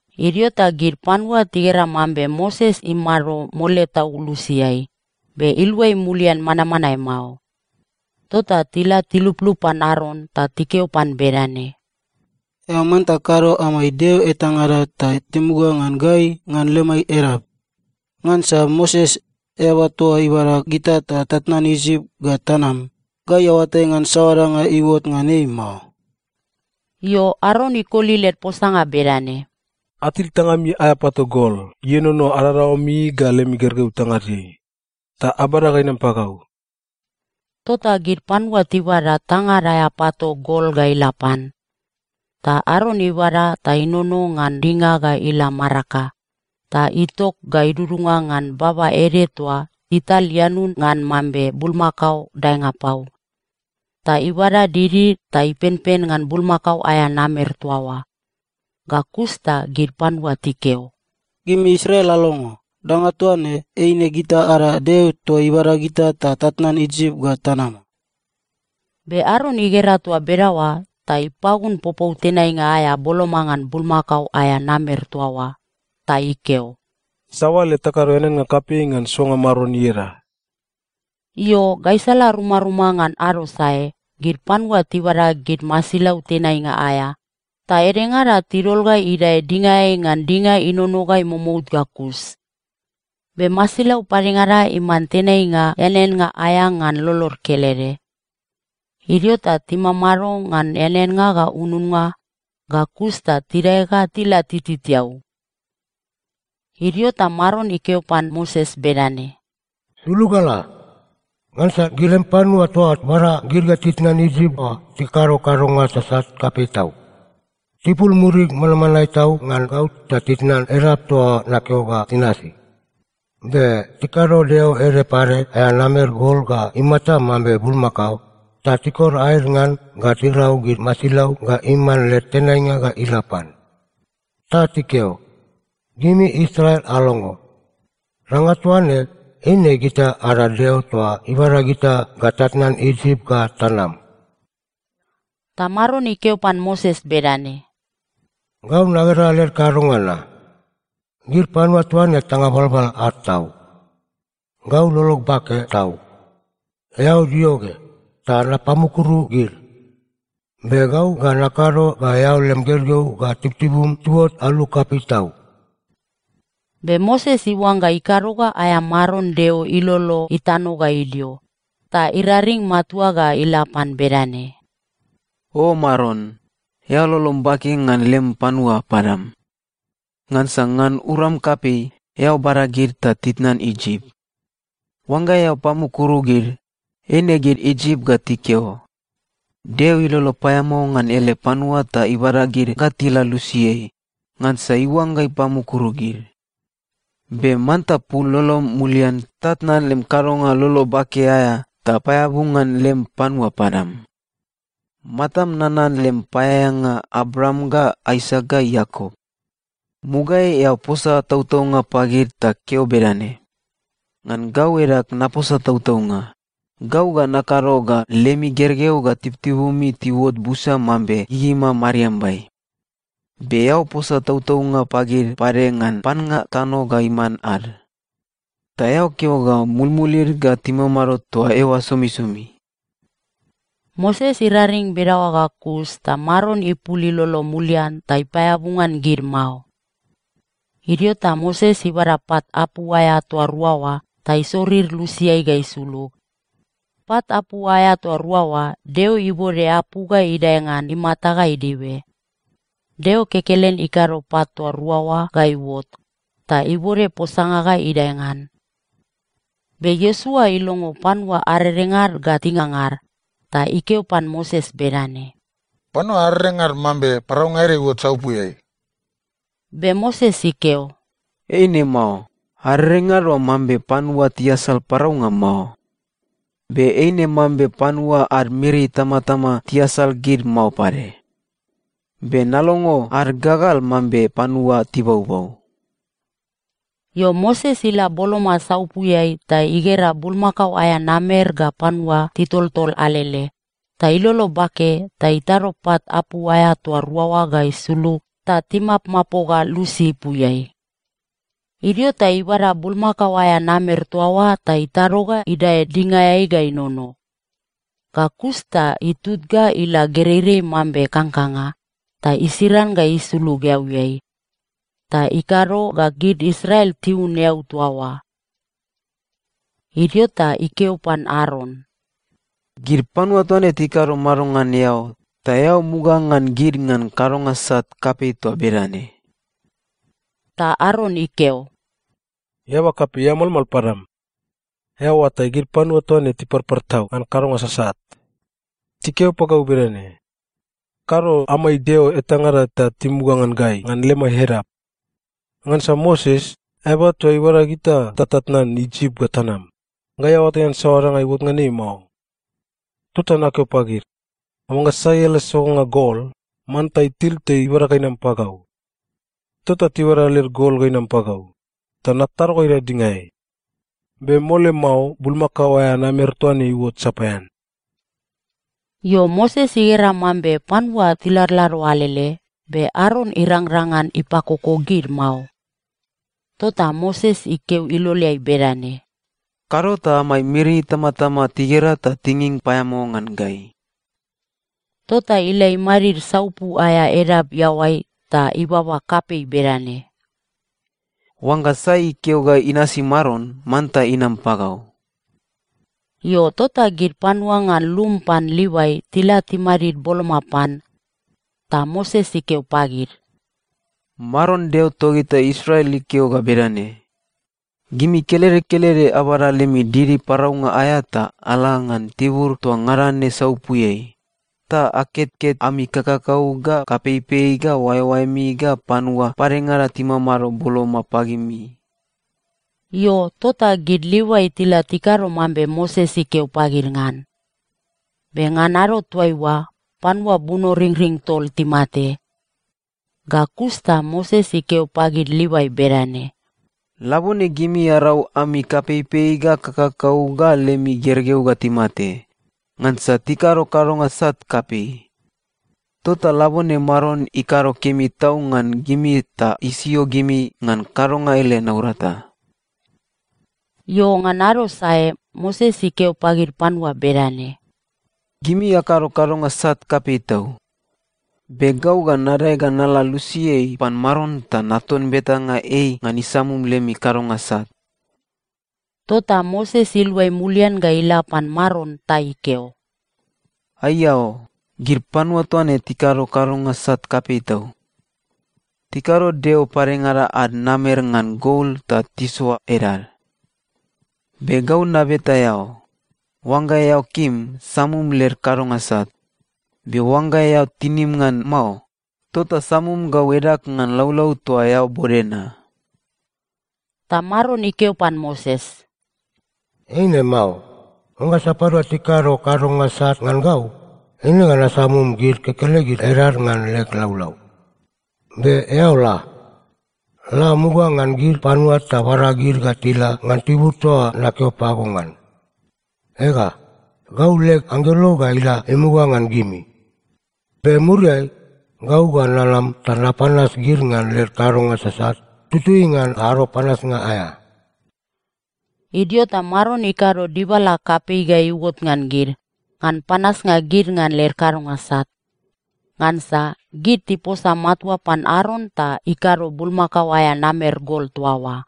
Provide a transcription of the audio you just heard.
Idio ta gid panua tigera mambe Moses imamado mole tau lusiai, be iluai mulian manmanae mao. Tota tila tiluplup pan Aron ta tikeo pan bedane, “Eao manta kado amai deo etangada ta timuga ngan gai ngan lemai edap. Ngansa Moses, eaba toa ibada gita ta tatnan Isip ga tanam, gai aoatai ngan saoa danga iuot ngan ei mao.” Io, Aron ikoli led posanga bedane, “Atil tangami aea pato gol ienono adadaoami ga lemi gergeu tangadeai, ta abada ga inam pagau.” Tota gid panua tibada tangad aea pato gol ga ila pan. Ta Aron ibada ta inono ngan dinga ga ila maraka, ta itok ga idudunga ngan baba ede toa ital ianun ngan mambe bulmakao daenga pau. Ta ibada didi ta ipenpen ngan bulmakao aea namer toa oa. Ga kus ta gid panua tikeo, “Gimi Israel alongo. Danga toa ne, eine gita ada deo toa ibada gita ta tatnan Isip ga tanam.” Be Aron igera toa bedaoa ta ipagun popou tenainga aea boloma ngan bulmakao aea namer toa oa. Ta ikeo, “Sabale takado eaneannga kapei ngan soanga Maron ieda.” Io, gaisala rumaruma ngan ado sae, gid panua tibada gid masilau tenainga aea, ta edengada tidol ga idae dingaeai ngan dinga inono ga imomout ga kus. Be masilau padengada iman tenainga eaneannga aea ngan lolod kelede. Idio ta timamado ngan eaneannga ga ununnga, ga kus ta tidae ga tila tititiau. Idio ta Maron ikeo pan Moses bedane, “Sulug ga la! Ngansa gid lem panua toa bada gid ga titnan Isip oa tikado kadonga sasat kapei tau. Tipul murid manmanae tau ngan gau ta titnan edap toa nakeo ga tinasi. Be tikado deo ede pade aea namer gol ga imata mambe bulmakao, ta tikor aed ngan ga tirau gid masilau ga iman led tenainga ga ila pan. Ta tikeo, ‘Gimi Israel alongo. Danga toa ne, eine gita ada deo toa ibada gita ga tatnan Isip ga tanam.’” Ta Maron ikeo pan Moses bedane, “Gau nagera led kadonga na. Gid panua toa ne tanga balbal ad tau. Gau lolog bake tau. Eao dio ge, ta napamukuru gid. Be gau ga nakado ga eao lem gergeu ga tibutibum tiuot alu kapei tau.” Be Moses iuangga ikado ga aea Maron Deo ilolo itano ga idio, ta iraring matua ga ila pan bedane, “O Maron, eao lolom bake ngan lem panua padam. Ngansa ngan uram kapei, eao bada gid ta titnan Isip. Oangga eao pamukuru gid, eine gid Isip ga tikeo, ‘Deo ilolo paeamao ngan ele panua ta ibada gid ga tila lusiai, ngansa iuangga ipamukuru gid.’ Be manta pul lolom mulian ta tnan lem kadonga lolo bake aea ta paeabu ngan lem panua padam. Matam nanan lem paeaeanga Abraam ga Aisak ga Iakop. Mugaeai eao posa tautaunga pagid ta keo bedane, ‘Ngan gau edag naposa tautaunga, gau ga nakado ga lemi gergeu ga tibutibumi tiuot busa mambe gigima mariambai.’ Be eao posa tautaunga pagid pade ngan pannga tano ga iman ad, ta eao keo ga mulmulid ga timamado toa eoa somisomi.” Moses iraring bedaoa ga kus ta Maron ipul ilolo mulian ta ipaeabu ngan gid mao. Idio ta Moses ibada pat apu aea toa rua oa ta isorir lusiai ga isulug. Pat apu aea toa rua oa, Deo ibode apu ga idae ngan imata ga idibe. Deo kekelen ikado pat toa rua oa ga iuot, ta ibode posanga ga idae ngan. Be Iosua ilongo panua arerengad ga tingangar, ta ikeo pan Moses bedane, “Panua arerengad mambe paraunga ede iuot saupuiai.” Be Moses ikeo, “Eine mao. Arerengad oa mambe panua tiasal paraunga mao. Be eine mambe panua ad miri itamatama tiasal gid mao pade. Be nalongo ad gagal mambe panua tibaubau.” Io, Moses ila boloma saupuiai ta igera bulmakao aea namer ga panua titoltol alele, ta ilolo bake ta itado pat apu aea toa rua oa ga isulug ta timapmapoga lusi ipuiai. Idio ta ibada bulmakao aea namer toa oa ta itado ga idae dingaeai ga inono. Ga kus ta itut ga ila gereirei mambe kangkanga, ta isiran ga isulug eauiai, ta ikado ga gid Israel tiun eau toa oa. Idio ta ikeo pan Aron, “Gid panua toa ne tikado mado ngan eao, ta eao muga ngan gid ngan kadonga sat kapei toa bedane?” Ta Aron ikeo, “Eaba kapei, eao malmal padam. Eao oatai, gid panua toa ne tiparpar tau ngan kadonga sasat. Tikeo pagau bedane, ‘Kado amai deo etangada ta timuga ngan gai ngan lemai edap. Ngansa Moses, eaba toa ibada gita ta tatnan Isip ga tanam, gai aoatai ngan saoa danga iuot ngan ei mao.’ Tota nakeo pagid, ‘Oangga sai ele sogonga gol, manta itil ta ibada ga inam pagau.’ Tota tibada led gol ga inam pagau, ta natado ga idae dingaeai. Be mole mao bulmakao aea namer toa ne iuot sapaean.” Io, Moses igera mambe panua tiladlado alele, be Aron irangrang ngan ipakoko gid mao. Tota Moses ikeo iloleai bedane, “Kado ta amai miri itamatama tigera ta tinging paeamao ngan gai.” Tota ila imadid saupu aea edap iaoai ta ibaba kapei bedane, “Oangga sai ikeo ga inasi Maron, manta inam pagau.” Io, tota gid panua ngan lum pan Livai tila timadid boloma pan. Ta Moses ikeo pagid, “Maron Deo togita Israel ikeo ga bedane, ‘Gimi kelede kelede abada lemi didi paraunga aea ta ala ngan tibur toa ngada ne saupuiai, ta aketket ami kakakau ga kapeipei ga oaeoaemi ga panua padengada timamado boloma pagimi.’” Io, tota gid Livai tila tikado mambe Moses ikeo pagid ngan. Be ngan ado toaiua, panua bunoringring tol timate. Ga kus ta Moses ikeo pagid Livai bedane, “Labone gimi arau ami kapeipei ga kakakau ga lemi gergeu ga timate, ngansa tikado kadonga sat kapei. Tota labone Maron ikado kemi tau ngan gimi ta isio gimi ngan kadonga ele naurata.” Io, ngan ado sae Moses ikeo pagid panua bedane, “Gimi akado kadonga sat kapei tau. Be gau ga nadae ga nala lusiai pan Maron ta naton betanga ei ngan isamum lemi kadonga sat.” Tota Moses iluai mulian ga ila pan Maron ta ikeo, “Aiao! Gid panua toa ne tikado kadonga sat kapei tau. Tikado deo padengada ad namer ngan gol ta tisoa edad. Be gau nabeta eao, oangga eao kim, samum led kadonga sat. Be oangga eao tinim ngan mao, tota samum gau edag ngan laulau toa eao bode na.” Ta Maron ikeo pan Moses, “Eine mao. Oangga sapadua tikado kadonga sat ngan gau, eine ga nasamum gid kekelegid edad ngan leg laulau. Be eao la. La muga ngan gid panua ta bada gid ga tila ngan tibur toa nakeo pago ngan. Ega, gau leg anggelo ga ila imuga ngan gimi. Be muriai, gau ga nanam ta napanas gid ngan led kadonga sasat tutui ngan ado panasnga aea.” Idio ta Maron ikado dibala kapei ga iuot ngan gid, ngan panasnga gid ngan led kadonga sat. Ngansa gid tiposa matua pan Aron ta ikado bulmakao aea namer gol toa oa.